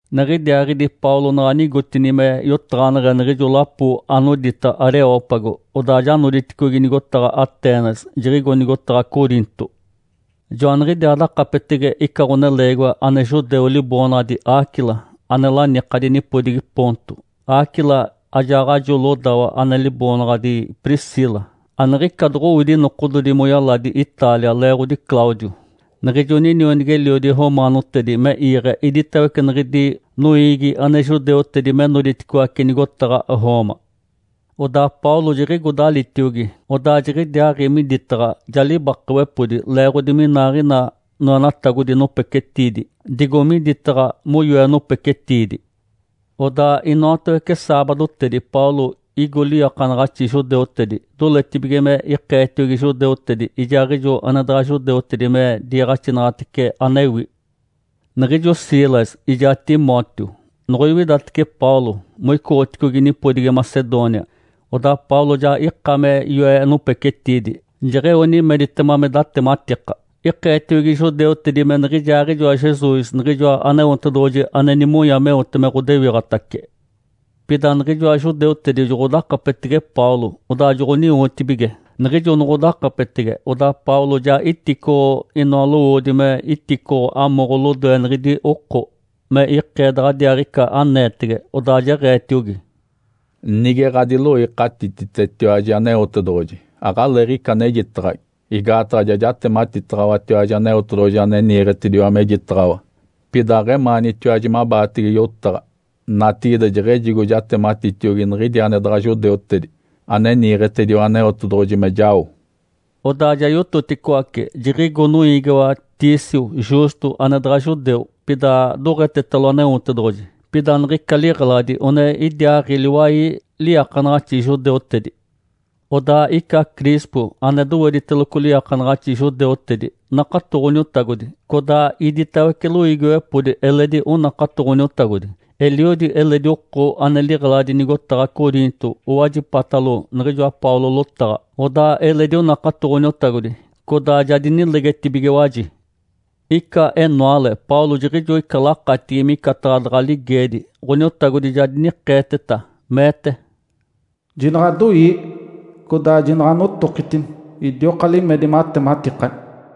Niɡ̶idiaaɡ̶idi Paulo naɡ̶a nigotini me yotaɡ̶aneɡ̶e niɡ̶ijo lapo anodita Areópago, odaa ja noditicogi nigotaɡ̶a Atenas, jiɡ̶igo nigotaɡ̶a Coriinto. Joaniɡ̶idiaa dakapetege ica ɡ̶oneleegiwa ane judeu liboonaɡ̶adi Áquila, ane lanikadi nipodigi Ponto. Áquila ajaaɡ̶ajo lodawa ane liboonaɡ̶adi Priscila, aniɡ̶ica doɡ̶owidi nokododi moyaladi Itália leeɡ̶odi Cláudio, niɡ̶ijo ninionigi-eliodi romaanotedi, me iiɡ̶e iditawece niɡ̶idi noiigi ane judeutedi me noditicoaci nigotaɡ̶a Roma. Odaa Paulo jiɡ̶igo dalitiogi, odaa jiɡ̶idiaaɡ̶i miditaɡ̶a, ja libakawepodi, leeɡ̶odi minaaɡ̶ina noenatagodi nopecetiidi digo miditaɡ̶a moyoe nopecetiidi. Odaa inoatawece saabadotedi Paulo igo liiakanaɡ̶axi judeutedi doletibige me ikeetiogi judeutedi ijaaɡ̶ijo ane daɡ̶a judeutedi me diiɡ̶axinaɡ̶atece anewi. Niɡ̶ijo Silas ijaa Timóteo noɡ̶oiwidatece Paulo, moicoɡ̶oticogi nipodigi Macedônia, odaa Paulo ja ika me yoe nopecetiidi, jeɡ̶eo nimeditema me datematika. Ikeetiogi judeutedi me niɡ̶ijaaɡ̶ijoa Jesus Niɡ̶ijoa Aneotedoɡ̶oji ane nimonya meote me ɡ̶odewiɡ̶atace. Pida niɡ̶ijoa judeutedi joɡ̶odakapetege Paulo, odaa joɡ̶oniwotibige. Niɡ̶ijo noɡ̶odakapetege, odaa Paulo ja iticoɡ̶o inoa lowoodi me iticoɡ̶o amoɡ̶o lodoe niɡ̶idi oko, me ikee daɡ̶adiaaɡ̶ica aneetege, odaa jeɡ̶eetiogi, “Nige ɡ̶adiloikatititetiwaji Aneotedoɡ̶oji, aɡ̶aleeɡ̶ica anejitaɡ̶agi, igaataɡ̶a ja jatematitaɡ̶awatiwaji Aneotedoɡ̶oji ane niiɡ̶etediwa mejitaɡ̶awa, pida aɡ̶emaanitiwaji mabaatege yotaɡ̶a. Natigide jeɡ̶ejigo jatematitiogi niɡ̶idi ane daɡ̶a judeutedi ane niiɡ̶etediwa Aneotedoɡ̶oji me jao.” Odaa ja yototicoace, jiɡ̶igo noiigiwa Tício Justo ane daɡ̶a judeu, pida doɡ̶etetalo Aneotedoɡ̶oji. Pida niɡ̶ica liɡ̶eladi one idiaaɡ̶i liwai liiakanaɡ̶axi judeutedi. Odaa ica Crispo ane dowediteloco liiakanaɡ̶axi judeutedi nakato Ǥoniotagodi, codaa iditawece loiigiwepodi eledi onakato Ǥoniotagodi. Eliodi eledi oko ane liɡ̶eladi nigotaɡ̶a Corinto owajipatalo niɡ̶ijoa Paulo lotaɡ̶a, odaa eledi onakato Ǥoniotagodi, codaa ja dinilegetibigiwaji. Ica enoale Paulo jiɡ̶ijo ica lakatigi micataɡ̶a daɡ̶a ligeedi, Ǥoniotagodi ja dinikeeteta, meete, “Jinaɡ̶adoii! Codaa jinaɡ̶anotokitini, idioka limedi matematikani!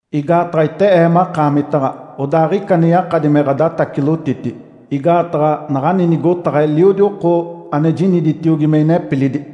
Igaataɡ̶a ite Ee makaamitaɡ̶a, odaa aɡ̶ica ane yakadi me ɡ̶adatacilotiti. Igaataɡ̶a naɡ̶ani nigotaɡ̶a eliodi oko ane jiniditiogi me inepilidi.”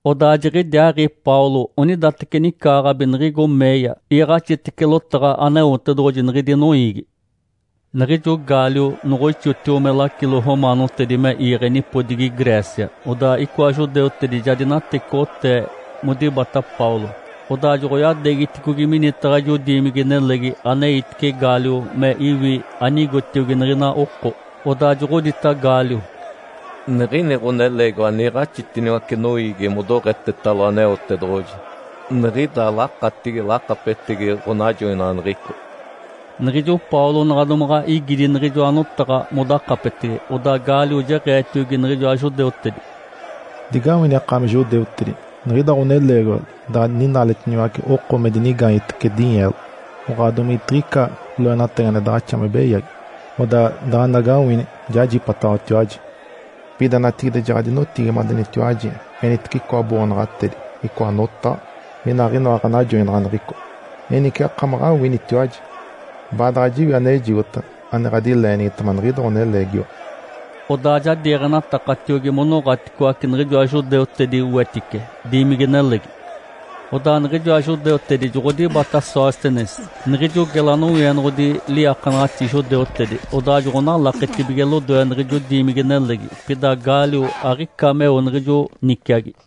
Odaa jiɡ̶idiaaɡ̶i Paulo onidateci nicaaɡ̶abi niɡ̶igo meeya, iiɡ̶axitece lotaɡ̶a Aneotedoɡ̶oji niɡ̶idi noiigi. Niɡ̶ijo Gálio noɡ̶oixotio me lacilo romaanotedi me iiɡ̶e nipodigi Grécia, odaa icoa judeutedi ja dinatecoɡ̶otee modibata Paulo, odaa joɡ̶oyadeegiticogi minitaɡ̶a ijo diimigi-nelegi aneitice Gálio me iwi anigotiogi niɡ̶ina oko. Odaa joɡ̶odita Gálio, “Niɡ̶ini ɡ̶oneleegiwa niiɡ̶axitiniwace noiigi modoɡ̶etetalo Aneotedoɡ̶oji niɡ̶ida lakatigi lakapetegi ɡ̶onajoinaɡ̶aneɡ̶eco.” Niɡ̶ijo Paulo naɡ̶a domaɡ̶a igidi niɡ̶ijoa notaɡ̶a modakapetege, odaa Gálio jeɡ̶eetiogi niɡ̶ijoa judeutedi, “Digawini akaami judeutedi! Niɡ̶ida ɡ̶oneleegiwa daɡ̶a ninaaletiniwace oko me dinigaanyetece dinyeelo, oɡ̶oa domigetiɡ̶ica loenatagi ane daɡ̶axa me beyagi, odaa daɡ̶anagawini jajipataɡ̶awatiwaji. Pida natigide jaɡ̶adinotigimadenitiwaji enitece icoa boonaɡ̶atedi, icoa notaɡ̶a, inaaɡ̶inoa ɡ̶anajoinaɡ̶aneɡ̶eco. Enice akamaɡ̶awinitiwaji, baadaɡ̶a jiwi anejigota ane ɡ̶adileenigitema niɡ̶ida ɡ̶oneleegiwa.” Odaa ja diiɡ̶enatakatiogi monoɡ̶aticoace niɡ̶ijoa judeutedi wetice diimigi-nelegi. Odaa niɡ̶ijoa judeutedi joɡ̶odibata Sóstenes niɡ̶ijo gela nowienoɡ̶odi liiakanaɡ̶axi judeutedi, odaa joɡ̶onalaketibige lodoe niɡ̶ijo diimigi-nelegi. Pida Gálio aɡ̶ica meo niɡ̶ijo niciagi.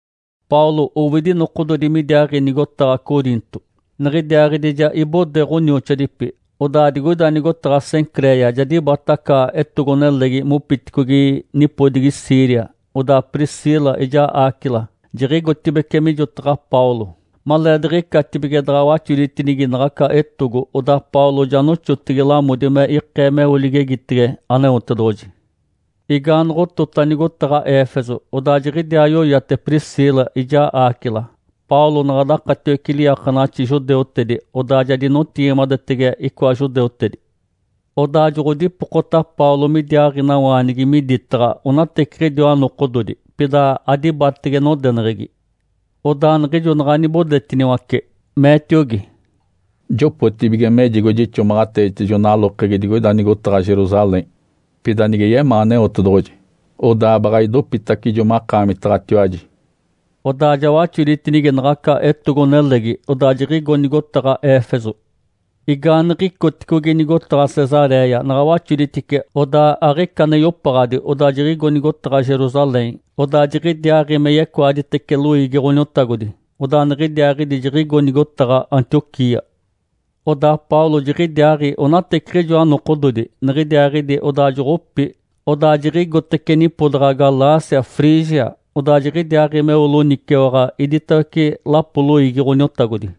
Paulo owidi nokododi midiaaɡ̶i nigotaɡ̶a Coriinto. Niɡ̶idiaaɡ̶idi ja ibode ɡ̶onioxoadipi, odaa digoida nigotaɡ̶a Cencréia ja dibata aca etogo-nelegi mopiticogi nipodigi Síria. Odaa Priscila ijaa Áquila jiɡ̶igotibeci mijotaɡ̶a Paulo. Maleediɡ̶icatibige daɡ̶a waxoditinigi naɡ̶aca etogo, odaa Paulo ja noxotegi lamodi me ikee meo ligegitege Aneotedoɡ̶oji. Igaanoɡ̶otota nigotaɡ̶a Éfeso, odaa jiɡ̶idiaa yoyate Priscila ijaa Áquila. Paulo naɡ̶a dakatiwece liiakanaɡ̶axi judeutedi, odaa ja dinotigimadetege icoa judeutedi. Odaa joɡ̶odipokota Paulo midiaaɡ̶inawaanigi miditaɡ̶a onateciɡ̶idiwa nokododi. Pida adibatege nodeneɡ̶egi. Odaa niɡ̶ijo naɡ̶a nibodetiniwace, meetiogi, “Jopotibige mejigo jixomaɡ̶ateetijo nalokegi digoida nigotaɡ̶a Jerusalém. Pida nige yemaa Aneotedoɡ̶oji, odaa baɡ̶a idopitacijo makaamitaɡ̶atiwaji.” Odaa ja waxoditinigi naɡ̶aca etogo-nelegi, odaa jiɡ̶igo nigotaɡ̶a Éfeso. Igaaniɡ̶icoticogi nigotaɡ̶a Cesaréia, naɡ̶a waxoditice, odaa aɡ̶ica ane yopaɡ̶adi odaa jiɡ̶igo nigotaɡ̶a Jerusalém, odaa jiɡ̶idiaaɡ̶i me yecoaditece loiigi Ǥoniotagodi. Odaa niɡ̶idiaaɡ̶idi jiɡ̶igo nigotaɡ̶a Antioquia. Odaa Paulo jiɡ̶idiaaɡ̶i onateciɡ̶ijoa nokododi, niɡ̶idiaaɡ̶idi odaa joɡ̶opi. Odaa jiɡ̶igotece nipodaɡ̶a Galácia, Frígia, odaa jiɡ̶idiaaɡ̶i meo loniciwaɡ̶a idiwatawece lapoli loiigi Ǥoniotagodi.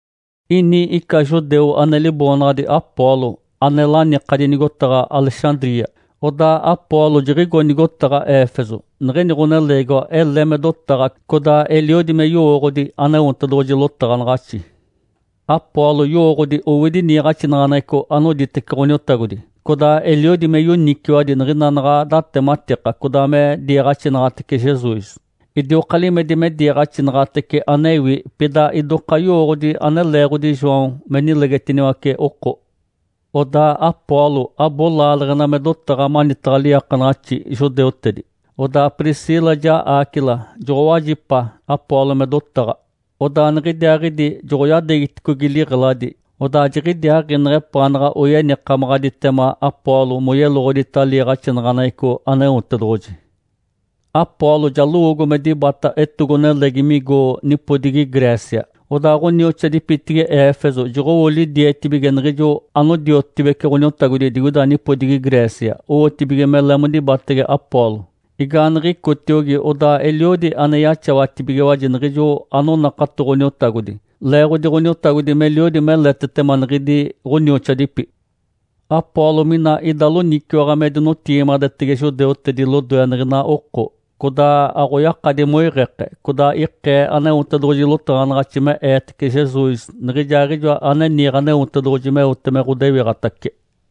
Ini ica judeu ane liboonaɡ̶adi Apolo ane lanikadi nigotaɡ̶a Alexandria. Odaa Apolo jiɡ̶igo nigotaɡ̶a Éfeso. Niɡ̶ini ɡ̶oneleegiwa ele me dotaɡ̶a, codaa eliodi me yowooɡ̶odi Aneotedoɡ̶oji lotaɡ̶anaɡ̶axi. Apolo yowooɡ̶odi owidi niiɡ̶axinaɡ̶aneɡ̶eco anoditece Ǥoniotagodi, codaa eliodi me yoniciwadi niɡ̶ina naɡ̶a datematika codaa me diiɡ̶axinaɡ̶atece Jesus. Idioka limedi me diiɡ̶axinaɡ̶atece anewi. Pida idoka yowooɡ̶odi ane leeɡ̶odi João me nilegetiniwace oko. Odaa Apolo abo laaleɡ̶ena me dotaɡ̶a manitaɡ̶a liiakanaɡ̶axi judeutedi. Odaa Priscila ijaa Áquila joɡ̶owajipa Apolo me dotaɡ̶a, odaa niɡ̶idiaaɡ̶idi joɡ̶oyadeegiticogi liɡ̶eladi. Odaa jiɡ̶idiaaɡ̶i neɡ̶epaanaɡ̶a oyenikamaɡ̶aditema Apolo moyeloɡ̶odita liiɡ̶axinaɡ̶aneɡ̶eco Aneotedoɡ̶oji. Apolo ja lowoogo me dibata etogo-nelegi migo nipodigi Grécia. Odaa ɡ̶onioxoadipitigi Éfeso joɡ̶owo lidietibige niɡ̶ijo anodiotibece Ǥoniotagodi digoida nipodigi Grécia owotibige mele modibatege Apolo. Igaaniɡ̶icotiogi odaa eliodi ane yaxawatibigiwaji niɡ̶ijo anonakato Ǥoniotagodi leeɡ̶odi Ǥoniotagodi meliodi meletetema niɡ̶idi ɡ̶onioxoadipi. Apolo mina ida loniciwaɡ̶a me dinotigimadetege judeutedi lodoe niɡ̶ina oko, codaa aɡ̶oyakadi moiɡ̶eke, codaa ikee Aneotedoɡ̶oji lotaɡ̶anaɡ̶axi me eetece Jesus Niɡ̶ijaaɡ̶ijoa ane niiɡ̶e Aneotedoɡ̶oji meote me ɡ̶odewiɡ̶atace.